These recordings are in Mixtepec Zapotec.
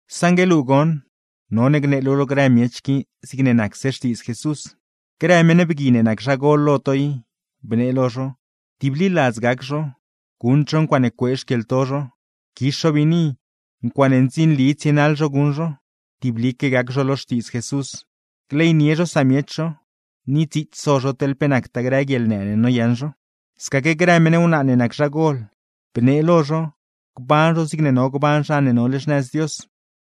Saṉgue luu goṉ, none gnee luu lo grë miech qui zigne nacse Xtiidz Jesús. Grë meṉ bgui ne nac zha gol lo to i, bnee lo zho: tibliladz gac zho, guṉd zho ncuaaṉe cuee xquieḻto zho, quix zho biini, ncuaaṉe ndzinli tsienaḻ zho guṉ zho; tiblique gac zho lo Xtiidz Jesús, gleynie zho samiech zho, ni dziits so zho teḻ pe nactaa grë guieḻnë ne noyaṉ zho. Scaquegaa grë meṉ wnaa ne nac zhagol, bnee lo zho: gban zho zigne no gban zha ne nole xnëz Dios,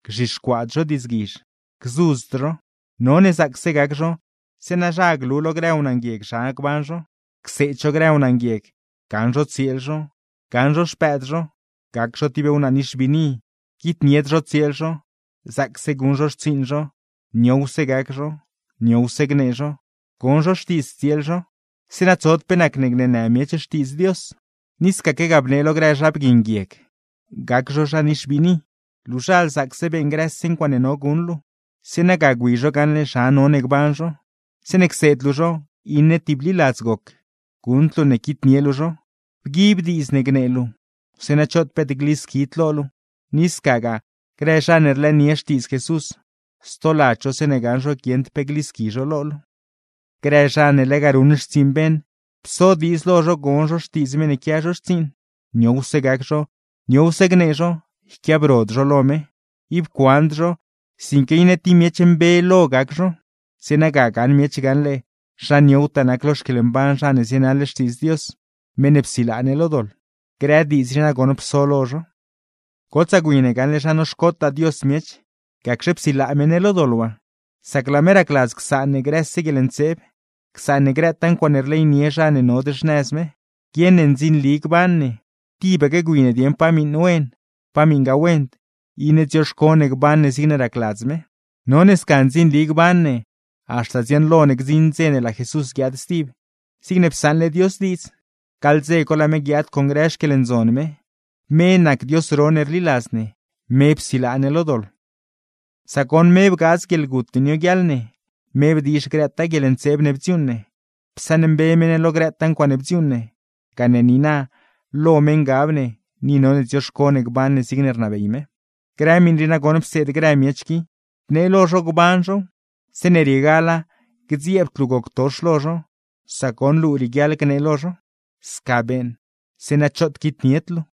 gzhixcuaad zho diidzguizh, gzudzd zho. None zaacse gac zho, zeeṉa zha glu lo grë wnaa nguieg zha gban zho. Cseed zho grë wnaa nguieg: gaṉ zho tsieel zho, gaṉ zho xpëëd zho, gac zho tib wnaa nix biini, quitnied zho tsieel zho; zaacse guṉ zho xtsiiṉ zho, niowse gac zho, niowse gnee zho, gon zho xtiidz tsieel zho; zeeṉa tsod pe nacne gneenë miech Xtiidz Dios. Ni scaquegaa bnee lo grë zha bgui nguieg, gac zho zha nix biini. Luuzhal zaacse beeṉ grëse ncuaaṉe no guṉ luu, zeeṉa ga gwi zho gaṉle zha none gban zho. Zeeṉe cseed luu zho, iṉe tibliladz goc, guṉd luu ne quitnie luu zho. Bguib diidz ne gnee luu, zeeṉa choot peet glisquid lo luu; ni scagaa, grë zha ne rlëënie Xtiidz Jesús, stoladz zho zeeṉe gaṉ zho guieṉd pe glisqui zho lo ne. Grë zha ne lega ruṉ xtsiiṉ beṉ, pso diidz lo zho gon zho xtiidz meṉ ne quia zho xtsiiṉ, niowse gac zho, niowse gnee zho, yquiabrod zho lo me. Ib cuand zho, sinque iṉe ti miech mbe lo gac zho; zeeṉa ga gaṉ miech gaṉle zha niowtaa nac lo xquieḻmban zha ne zienaḻ Xtiidz Dios, meṉ ne psilaa ne lo doḻ. Grë diidz rii nagoṉ pso lo zho. Gotsaa gwi ne gaṉle zha noxcotaa Dios miech, gacxe psilaa me ne lo doḻ waa; sac laa me racladz csaan ne grëse guieḻntseeb, csaan ne grëtaa ncuaaṉe rleynie zha ne nod xnëz me, guieṉ ne ndzinli gban ne, tibaque gwi ne dieṉ pa miṉ wen, pa miṉgaa wend, iṉe dzioxco ne gban ne zigne racladz me. Sca none gban ne, haxta dziaṉlo ne gdziṉ dze ne laa Jesús guiaad stib, zigne psaṉle Dios diidz; gaḻ dze co, laa me guiaad con grë xquieḻndzon me. Me nac Dios ro ne rliladz ne, me psilaa ne lo doḻ. Sac goṉ, me bgaadz guieḻgut ne nioguiaḻ ne, me bdiizh grëtaa guieḻntseeb ne bdziuuṉ ne, psaṉmbe me ne lo grëtaa ncuaaṉe bdziuuṉ ne; gane niina, lo me ngab ne, ni none dzioxco ne gban ne zigne rnabey me. Grë miṉ rii nagoṉ pseed grë miech qui, bnee lo zho gban zhow. Zeeṉe riegala gdzieebd luu goctox lo zho, sac goṉ luu rieguiaḻ gnee lo zho. ¡Sca beeṉ, zeeṉa choot quitnied luu!